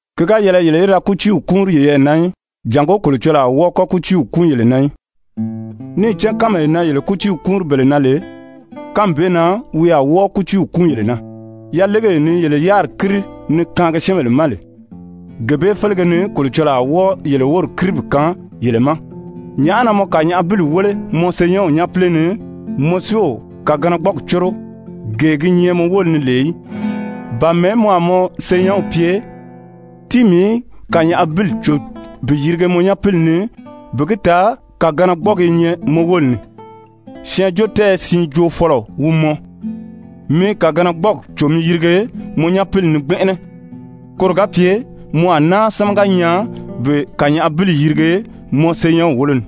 «Ki ga yɛlɛ yele í da kútiiw kúunri yeyɛɛ na í, jàngó Kolocɔlɔɔ a wɔ́ɔ kɔ́ kútiiw kúun yele na í. Níì cán kánmee na yele kútiiw kúunri bele na lè, kánmi bee na wi a wɔ́ɔ kútiiw kúun yele na. Yalegee ni yele yáriri kíri ni kaangi syɛ́ɛnbèle ma lè, gee bee félege ni Kolocɔlɔɔ a wɔ́ɔ yele wóri kíri bi kaan yele ma. Nyàʔá na mɔ kànyaʔabili wéle mɔ senyɛnw nyápile ni, mɔ si o kàganagbɔɔgi córo, gee gi nyɛ mɔ wóli ni lè í? Ba mɛ̀ɛ́ mɔ a mɔ senyɛnw pye: ‹Tíi mii í kànyaʔabili cò bi yirige mɔ nyapili ni,› bi gi taa kàganagbɔɔgi i nyɛ mɔ wóli ni? Syɛɛnjóotɛɛyɛ siin joofɔlɔ wi mɔ. Mi kàganagbɔɔgi cò mi yirige mɔ nyapili ni gbɛnʔɛnɛ, koro ga pye mɔ a náa sámaga nyaa bi kànyaʔabili yirige mɔ senyɛnw wólo ni.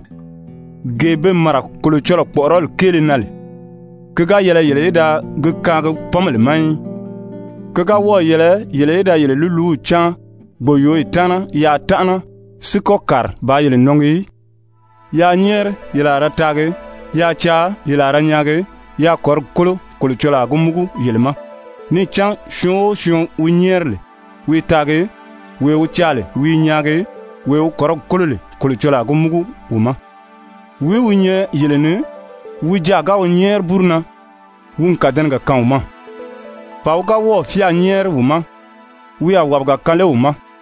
Gee be màra Kolocɔlɔɔ kpɔ̀ʔɔrɔli kéele na lè, ki ga yɛlɛ yele í da gi kaangi pɔ́nbèle ma í. Ki ga wɔ́ɔ̀ yɛlɛ yele í da yele lúluw cáan gbòyooyi taana yaa tánʔana si kɔ́ kàri baa yele nɔngi í. «Yaa nyɛ́ɛri, ye a ra taagi. Yaa caa, ye a ra nyaagi. Yaa kɔ̀rigi kólo, Kolocɔlɔɔ a gi múgu yele ma. Níì cán syɔɔn o syɔɔn wi nyɛ́ɛri lè, wi i taagi. Wee wi caa lè, wi i nyaagi. Wee wi kɔ̀rigi kólo lè, Kolocɔlɔɔ a gi múgu wi ma. Wìí wi nyɛ yele ni, wi jaà ga wi nyɛ́ɛri búru na, wi n kàdɛnɛgɛ kaan wi ma? Ba wi ga wɔ́ɔ̀ fyáa nyɛ́ɛri wi ma, wi a wàbiga kaan lé wi ma?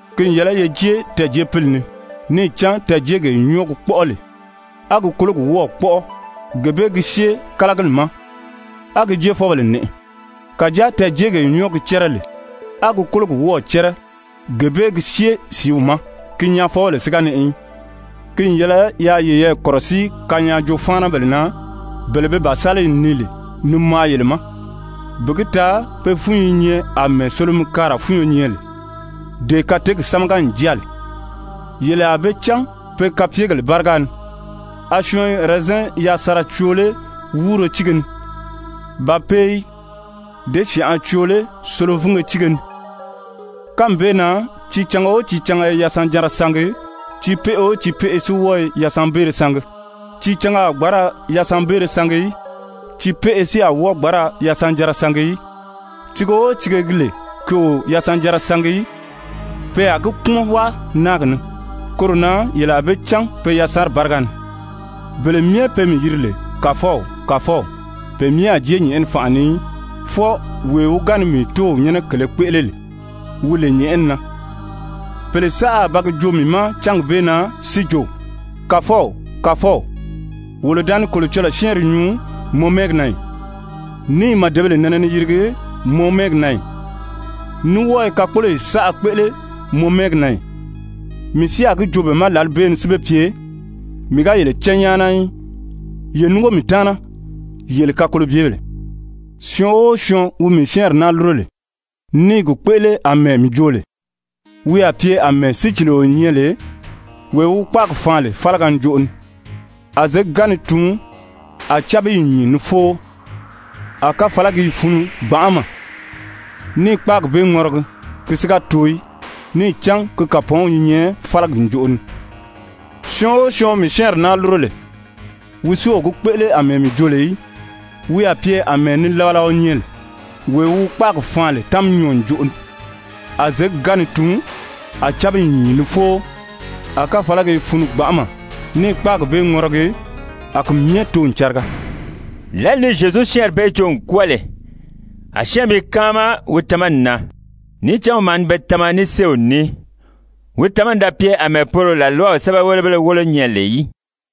«Ki n yɛlɛ ye jée tɛɛ̀jeepili ni. Níì cán tɛɛ̀jeegee nyɔ́ɔ gi kpɔ́ʔɔ lè, a gi kólogi wɔ́ɔ̀ kpɔ́ʔɔ, gee bee gi syée kálagili ma, a gi jéefɔbèle nɛʔɛ. Kàjáa tɛɛ̀jeegee nyɔ́ɔ gi cɛ́rɛ lè, a gi kólogi wɔ́ɔ̀ cɛ́rɛ, gee bee gi syée sìíw ma. Ki nyaafɔbèle si ga nɛʔɛ í. «Ki n yɛlɛ yaa yeyɛɛ kɔ̀rɔsíi kanyaajoo-fáanabèle na, bele be bàsaliyi nii lè ni maa yele ma, bi gi taa be fúnyi i nyɛ àmɛɛ solomikaara fúnyo nyɛ lè, dee kateegi sámaga n jáa lè. Yele a be cán pe kapyegèle báriga ni. A syɔɔn i ɛrɛzɛn yasanra coo lé wúuro tíige ni? Ba pe i děsyanʔa coo lé solovinge tíige ni? Kánmi bee na tiicanga o tiicanga i yasanjanra sangi. Tiipeʔe o tiipeʔe si wɔ́ɔ i yasanbeere sangi. Tiicanga a gbǎn ra yasanbeere sangi í. Tiipeʔe si a wɔ́ɔ gbǎn ra yasanjanra sangi í. Tiige o tiige gi lè ki o yasanjanra sangi í, pe a gi kpúmɔn wáa náagi ni. Koro na yele a be cán pe yasanri báriga ni. «Bele myɛ be mii yiri lè ‹Kàfɔw, Kàfɔw,› pe myɛ a jée nyɛ̀ʔɛni fànʔa ni í, fwɔɔ wee wi ga ni mii Tóow nyɛ́nɛ kèlē kpéʔele lè, wi lè nyɛ̀ʔɛni na. Pèle saʔa a ba gi joo mii ma cángi bee na si jo: ‹Kàfɔw, Kàfɔw, wolo da ni Kolocɔlɔɔ syɛ́ɛnri nyuu mɔ mɛ́ɛgi na ì, ní i màdebèle nɛnɛ ni yirigi mɔ mɛ́ɛgi na ì, ní wɔ́ɔ i kakpoloyi saʔa kpéʔele mɔ mɛ́ɛgi na ì?› Mii si a gi joo be ma lǎli bee ni si be pye: ‹Mii ga yele cán nyáana í. Ye núngo mii taana, yele kakolobyebèle.› «Syɔɔn o syɔɔn wi mii syɛ́ɛnri naa lúro lè, ní i gi kpéʔele àmɛɛ mii jo lè, wi a pye àmɛɛ sícilio nyɛ lè, wee wi wi kpáagi faan lè fálaga njoʔo ni. A zěgi ga ni tuun, a cábiyi nyìn ni fóo, a káfalagi i funu gbanʔama ní i kpáagi bee ŋɔrɔgi, ki si ga too í, níì cán ki kàpɔɔnw i nyɛ fálagi ǹjoʔo ni. Syɔɔn o syɔɔn wi mii syɛ́ɛnri naa lúro lè, wi si o gi kpéʔele àmɛɛ mii jo lè í, wi a pye àmɛɛ nilabalaɔ nyɛ lè, wee wi wi kpáagi faan lè táminyɔɔ ǹjoʔo ni. A zěgi ga ni tuun, a cábiyi nyìn ni fóo, a káfalagi i funu gbanʔama ní i kpáagi bee ŋɔrɔgi, a ki myɛ too n cariga.» Lǎli ni Zyezu syɛ́ɛnri bee joo n kwɔ́ɔ lè, a syɛ́ɛnmi i káama wi tamani na. Níì cán wi maa ni be tama ní séew ní. Wi tamani da pye àmɛɛ poro làlwaw sɛ́bɛwelebéle wólo nyɛ lè í.